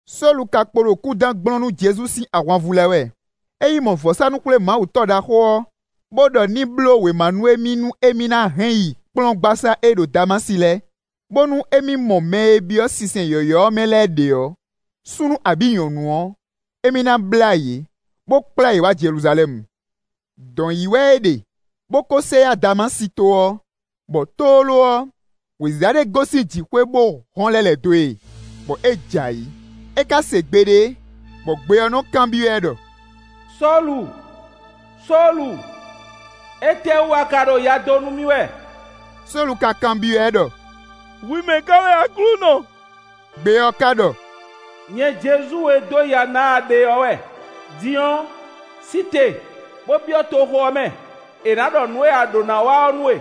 Sólu ka kpo ɖo kúdán gblɔ́n nú Jezu sín ahwanvú lɛ́ɛ wɛ. É yi mɔ vɔ̌sánú-xwlémawutɔ́ ɖaxó ɔ́, bó ɖɔ ní bló wěma nú émí nú émí ná hɛn yi kplɔ́ngbasá e ɖo Damási lɛ́ɛ, bónú émí mɔ mɛ e byɔ́ sinsɛn yɔ̌yɔ́ ɔ́ mɛ lɛ́ɛ ɖě ɔ́, súnnu abǐ nyɔ̌nu ɔ́, émí ná blá yě, bó kplá yě wá Jeluzalɛ́mu. Dɔ̌n ɔ́ yi wɛ é ɖe, bó kó sɛ yá Damási to ɔ́, bɔ tlóló ɔ́, wěziza ɖé gosín jǐxwé wá hɔ́n lɛ́ lɛ̌ dó e, bɔ é jɛ ayǐ. É ka se gbe ɖé, bɔ gbe ɔ́ nɔ́ kanbyɔ́ ɛ ɖɔ: “Sólu, Sólu, étɛ́wú a ka ɖo ya dó nú mì wɛ?” Sólu ka kanbyɔ́ ɛ ɖɔ: “Hwi mɛ̌ ká wɛ Aklúnɔ?” Gbe ɔ́ ká ɖɔ: “Nyɛ Jezu e dó ya ná a ɖe ɔ́ wɛ. Din ɔ́, sí te, bó byɔ́ toxo ɔ́ mɛ; è nǎ ɖɔ nǔ e a ɖǒ ná wa ɔ́ nú we.”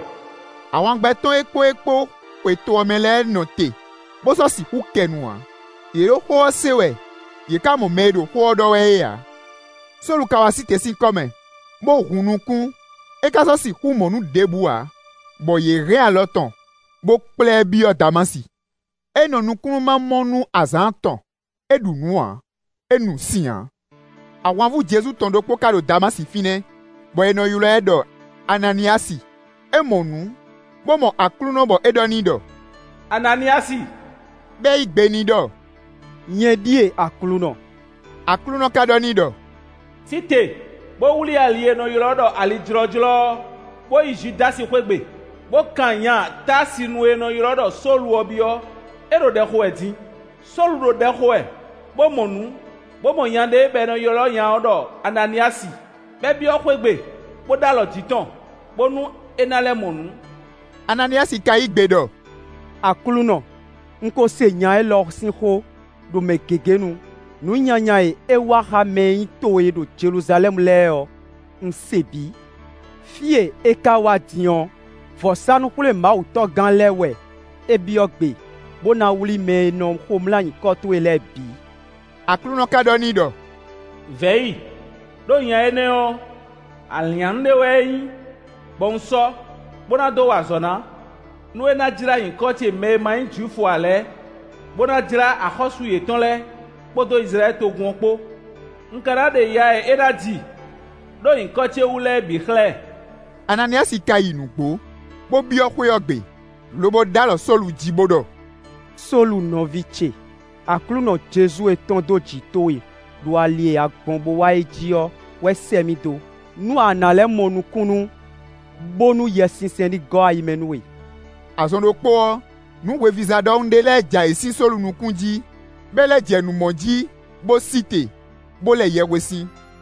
Ahwangbɛ́ tɔn e kpó é kpó xwe to ɔ́ mɛ lɛ́ɛ nɔ te, bó sɔ́ sixú kɛ nu ǎ. Yě ɖo xó ɔ́ se wɛ, yě ka mɔ mɛ e ɖo xó ɔ́ ɖɔ wɛ é ǎ. Sólu ka wá sí te sín kɔ́ mɛ, bó hun nukún, é ka sɔ́ sixú mɔ nǔ ɖěbǔ ǎ, bɔ yě hɛn alɔ tɔn, bó kplá ɛ byɔ́ Damási. É nɔ nukúnnú ma mɔ nú azǎn atɔn. É ɖu nǔ ǎ; é nu sin ǎ. Ahwanvú Jezu tɔn ɖokpó ka ɖo Damási fínɛ́, bɔ è nɔ ylɔ́ ɛ ɖɔ Ananíyasi. É mɔ nǔ, bó mɔ Aklúnɔ bɔ é ɖɔ n'i ɖɔ: “Ananíyasi.” Bɔ é yí gbe n'i ɖɔ: “Nyɛ ɖíe Aklúnɔ.” Aklúnɔ ka ɖɔ n'i ɖɔ: “Sí te, bó wlí ali e è nɔ ylɔ́ ɖɔ ali Jlɔ́jlɔ́ ɔ́, bó yi Judási xwé gbe, bó kan nya Táasinu e è nɔ ylɔ́ ɖɔ Sólu ɔ́ byɔ́; é ɖo ɖɛ xo wɛ din; Sólu ɖo ɖɛ xo wɛ, bó mɔ nǔ, bó mɔ nya ɖé, bɔ è nɔ ylɔ́ nya ɔ́ ɖɔ Ananíyasi, bɔ é byɔ́ xwé gbe, bó ɖó alɔ jǐ tɔn, bónú é ná lɛ́ mɔ nǔ.” Ananíyasi ka yí gbe ɖɔ: “Aklúnɔ! Un ko se nya élɔ́ sín xó, ɖo mɛ gěgé nu. Nǔ nyanya e é wa xá mɛ e nyí towe ɖo Jeluzalɛ́mu lɛ́ɛ ɔ́, un se bǐ. Fí e é ka wá din ɔ́, vɔ̌sánú-xwlémawutɔ́gán lɛ́ɛ wɛ é byɔ́ gbe, bó ná wlí mɛ e nɔ xomlá nyǐkɔ towe lɛ́ɛ bǐ.” Aklúnɔ ka ɖɔ n'i ɖɔ: “Vɛ̌ yi, ɖó nya énɛ́ ɔ́, alǐnnyánú ɖé wɛ é nyí, bɔ un sɔ́, bó ná dó wa azɔ̌ ná, nú é ná jlá nyǐkɔ ce mɛ e ma nyí Jwifu ǎ lɛ́ɛ, bó ná jlá axɔ́sú yětɔn lɛ́ɛ, kpódó Izlayɛ́li togun ɔ́ kpó. Un ka ná ɖe ya e é ná ji ɖó nyǐkɔ ce wú lɛ́ɛ bǐ xlɛ́ ɛ.” Ananíyasi ka yi nǔgbó, bó byɔ́ xwé ɔ́ gbe, lobo ɖó alɔ Sólu jí, bó ɖɔ: “Sólu nɔví ce! Aklúnɔ Jezu e tɔ́n dó jǐ towe ɖo ali e a gbɔn bó wá é jí ɔ́ wɛ sɛ́ mì dó, nú a nǎ lɛ́ mɔ nukúnnú, bónú Yɛsinsɛn ní gɔ́ ayi mɛ nú we.” Azɔn ɖokpó ɔ́, nǔ hwevízá ɖɔhun ɖé lɛ́ɛ jɛ ayǐ sín Sólu nukún jí, bɔ é lɛ́ jɛ nǔ mɔ jí bó sí te, bó lɛ yɛhwesin.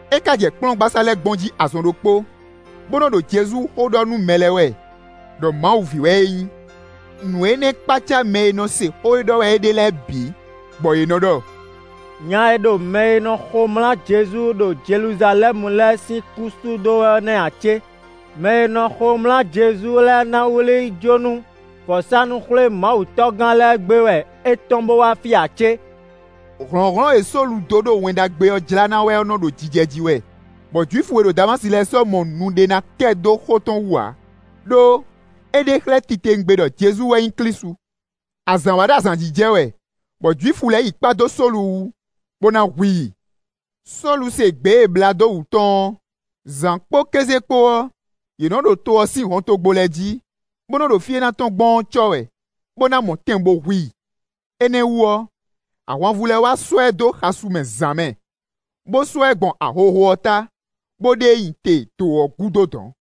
É ka jɛ kplɔ́ngbasá lɛ́ɛ gbɔn jí azɔn ɖokpó, bó nɔ́ ɖo Jezu xó ɖɔ nú mɛ lɛ́ɛ wɛ, ɖɔ Mawu ví wɛ é nyí. Nǔ énɛ́ kpácá mɛ e nɔ se xó e ɖɔ wɛ é ɖe lɛ́ɛ bǐ, bɔ yě nɔ́ ɖɔ: “Nya e ɖo mɛ e nɔ xomlá Jezu ɖo Jeluzalɛ́mu lɛ́ɛ sín kún sú dó wɛ ɔ́ nɛ́ ǎ cé? Mɛ e nɔ xomlá Jezu lɛ́ɛ ná wlí yi jó nú vɔ̌sánú-xwlémawutɔ́gán lɛ́ɛ gbé wɛ é tɔ́n bó wá fí ǎ cé?” Hlɔ̌nhlɔ́n e Sólu dó ɖo Wɛn Ɖagbe ɔ́ jlá ná wɛ ɔ́ nɔ́ ɖo jijɛ jí wɛ, bɔ Jwifu e ɖo Damási lɛ́ɛ sɔ́ mɔ nu ɖé ná kɛ dó xó tɔn wú ǎ; ɖó é ɖe xlɛ́ titewungbe ɖɔ Jezu wɛ nyí Klísu. Azǎn wá ɖo azǎn jí jɛ wɛ, bɔ Jwifu lɛ́ɛ yi kpá dó Sólu wú, bó ná hu i. Sólu se gbě e è blǎ dó wǔ tɔn ɔ́; zǎn kpó kéze kpó ɔ́, yě nɔ́ ɖo to ɔ́ sín hɔntogbó lɛ́ɛ jí, bó nɔ́ ɖo fí e é ná tɔ́n gbɔn ɔ́ cɔ́ wɛ, bó ná mɔ tɛn bo hu i. Énɛ́ wú ɔ́, ahwanvú lɛ́ɛ wá sɔ́ ɛ dó xasun mɛ zǎn mɛ, bó sɔ́ ɛ gbɔn ahohó ɔ́ ta, bó ɖe e nyi te dǒ ɔ́ gúdo dɔ̌n.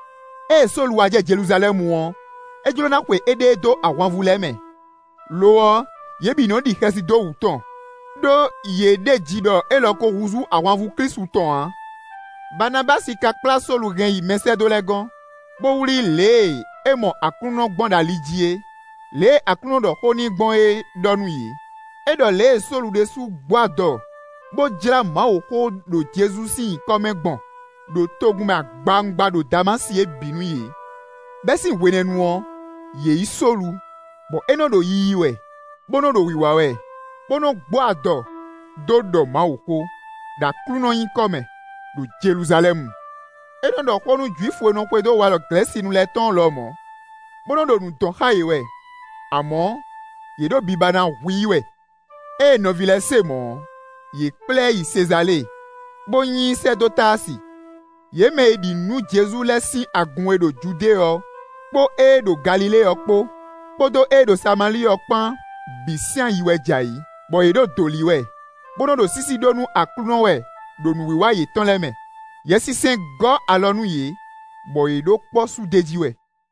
Ée Sólu wá jɛ Jeluzalɛ́mu ɔ́, é jló ná xwe éɖée dó ahwanvú lɛ́ɛ mɛ; lo ɔ́, yě bǐ nɔ́ ɖi xɛsi dó wǔ tɔn, ɖó yě ɖeji ɖɔ élɔ́ ko húzú ahwanvú Klísu tɔn ǎ. Baanabási ka kplá Sólu hɛn yi mɛsɛ́dó lɛ́ɛ gɔ́n, bó wlí lě e é mɔ Aklúnɔ gbɔn ɖo ali jí é, lě e Aklúnɔ ɖɔ xó n'i gbɔn é ɖɔ nú yě; é ɖɔ lě e Sólu ɖésú gbó adɔ bó jlá Mawuxó ɔ́ ɖo Jezu sín nyǐkɔ mɛ gbɔn, ɖo togun mɛ agbawungba ɖo Damási é bǐ nú yě. Bɛ́ sín hwenɛ́nu ɔ́, yě yí Sólu, bɔ é nɔ ɖo yiyi wɛ, bó nɔ́ ɖo wǐwá wɛ, bó nɔ́ gbó adɔ dó ɖɔ Mawuxó, ɖo Aklúnɔ nyǐkɔ mɛ, ɖo Jeluzalɛ́mu. É nɔ́ ɖɔ xó nú Jwifu e nɔ xwedó walɔ Glɛ̌sinu lɛ́ɛ tɔn ɔ́ lɔmɔ̌, bó nɔ́ ɖo nǔ dɔn xá yě wɛ; amɔ̌, yě ɖo biba ná hu i wɛ. Ée nɔví lɛ́ɛ se mɔ̌ ɔ́, yě kplá ɛ yi Sezalée, bó nyi i sɛ́ dó Táasi. Yě mɛ e ɖi nǔ nú Jezu lɛ́ɛ sín agun e ɖo Judée ɔ́ kpó ée ɖo Galilée ɔ́ kpó, kpódó ée ɖo Samalíi ɔ́ kpán bǐ sín ayi wɛ jɛ ayǐ, bɔ yě ɖo dǒ lí wɛ, bó nɔ́ ɖo sísí ɖó nú Aklúnɔ wɛ ɖo nǔwiwa yětɔn lɛ́ɛ mɛ; Yɛsinsɛn gɔ́ alɔ nú yě, bɔ yě ɖo kpɔ́ sú d'é jí wɛ.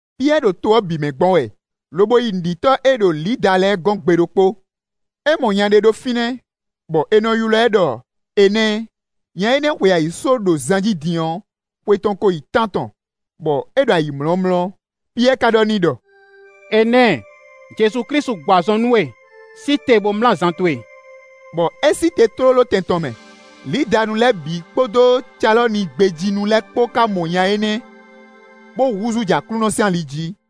Piyɛ́ɛ ɖo to ɔ́ bǐ mɛ gbɔn wɛ, lobo yi nǔɖitɔ́ e ɖo Lida lɛ́ɛ gɔ́n gbe ɖokpó. É mɔ nya ɖé ɖo fínɛ́, bɔ è nɔ ylɔ́ ɛ ɖɔ Enɛ́ɛ; nya énɛ́ xwe ayǐsó ɖo zan jí din ɔ́, xwe tɔn ko yi tántɔn; bɔ é ɖo ayǐmlɔ́mlɔ́. Piyɛ́ɛ ka ɖɔ n'i ɖɔ: “Enɛ́ɛ, Jezu Klísu gbɔ azɔn nú we; sí te bó mlá zan towe.” Bɔ é sí te tlóló tɛn tɔn mɛ. Lidanu lɛ́ɛ bǐ kpódó Calɔ́ni gbé jí nu lɛ́ɛ kpó ka mɔ nya énɛ́, bó húzú jɛ Aklúnɔ sín ali jí.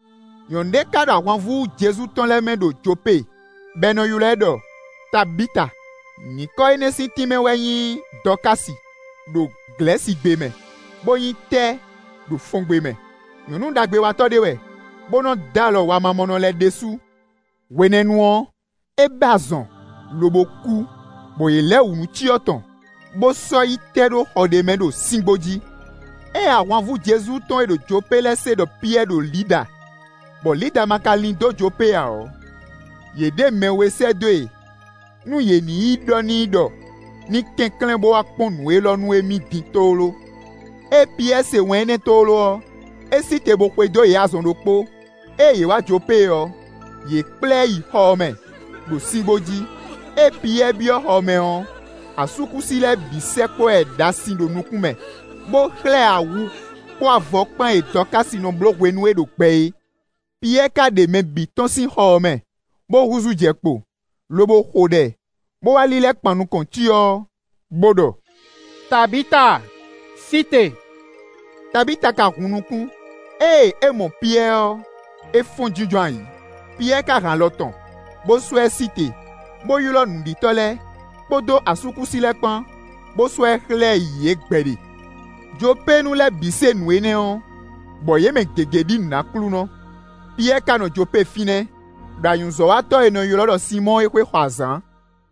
Nyɔ̌nu ɖé ka ɖo ahwanvú Jezu tɔn lɛ́ɛ mɛ ɖo Jopée, bɔ è nɔ ylɔ́ ɛ ɖɔ Tabita; (nyǐkɔ énɛ́ sín tínmɛ wɛ nyí “Dɔ̌kási” ɖo Glɛ̌sigbe mɛ, bó nyí “Tɛ́” ɖo Fɔngbe mɛ.) Nyɔ̌nu ɖagbewatɔ́ ɖé wɛ, bó nɔ́ dó alɔ wamamɔnɔ lɛ́ɛ ɖésú. Hwenɛ́nu ɔ́, é bɛ́ azɔn, lobo kú, bɔ yě lɛ wǔ nú cyɔ tɔn, bó sɔ́ yi tɛ́ ɖó xɔ ɖé mɛ, ɖo síngbó jí. Ée ahwanvú Jezu tɔn e ɖo Jopée lɛ́ɛ se ɖɔ Piyɛ́ɛ ɖo Lida, bɔ Lida ma ka lín dó Jopée ǎ ɔ́, yě ɖe mɛ we sɛ́ dó e nú yě ní yi ɖɔ n'i ɖɔ ní kɛnklɛ́n bó wá kpɔ́n nǔ élɔ́ nú émí din tlóló. Ée Piyɛ́ɛ se wɛn énɛ́ tlóló ɔ́, é sí te bó xwedó yě azɔn ɖokpó. Ée yě wá Jopée ɔ́, yě kplá ɛ yi xɔ ɔ́ mɛ, ɖo síngbó jí. Ée Piyɛ́ɛ byɔ́ xɔ ɔ́ mɛ ɔ́, asúkúsi lɛ́ɛ bǐ sɛkpɔ́ ɛ ɖasin ɖo nukún mɛ, bó xlɛ́ ɛ awu kpó avɔ kpán e Dɔ̌kási nɔ bló hwenu e é ɖo gbɛ é. Piyɛ́ɛ ka ɖe mɛ bǐ tɔ́n sín xɔ ɔ́ mɛ, bó húzú jɛ kpo, lobo xo ɖɛ, bó wá lílɛ́ kpan nukɔn cyɔ ɔ́, bó ɖɔ: “Tabita! Sí te!” Tabita ka hun nukún; ée é mɔ Piyɛ́ɛ ɔ́, é fɔ́n jínjɔ́n ayǐ. Piyɛ́ɛ ka hɛn alɔ tɔn, bó sɔ́ ɛ sí te, bó ylɔ́ nǔɖitɔ́ lɛ́ɛ, kpódó asúkúsi lɛ́ɛ kpán, bó sɔ́ ɛ xlɛ́ yě gbɛɖe. Jopéenu lɛ́ɛ bǐ se nǔ énɛ́ ɔ́, bɔ yě mɛ gěgé ɖi nǔ nú Aklúnɔ. Piyɛ́ɛ ka nɔ Jopée fínɛ́, ɖo anyǔzɔ́watɔ́ e è nɔ ylɔ́ ɖɔ Sinmɔ́ɔ é xwé xɔ azǎn.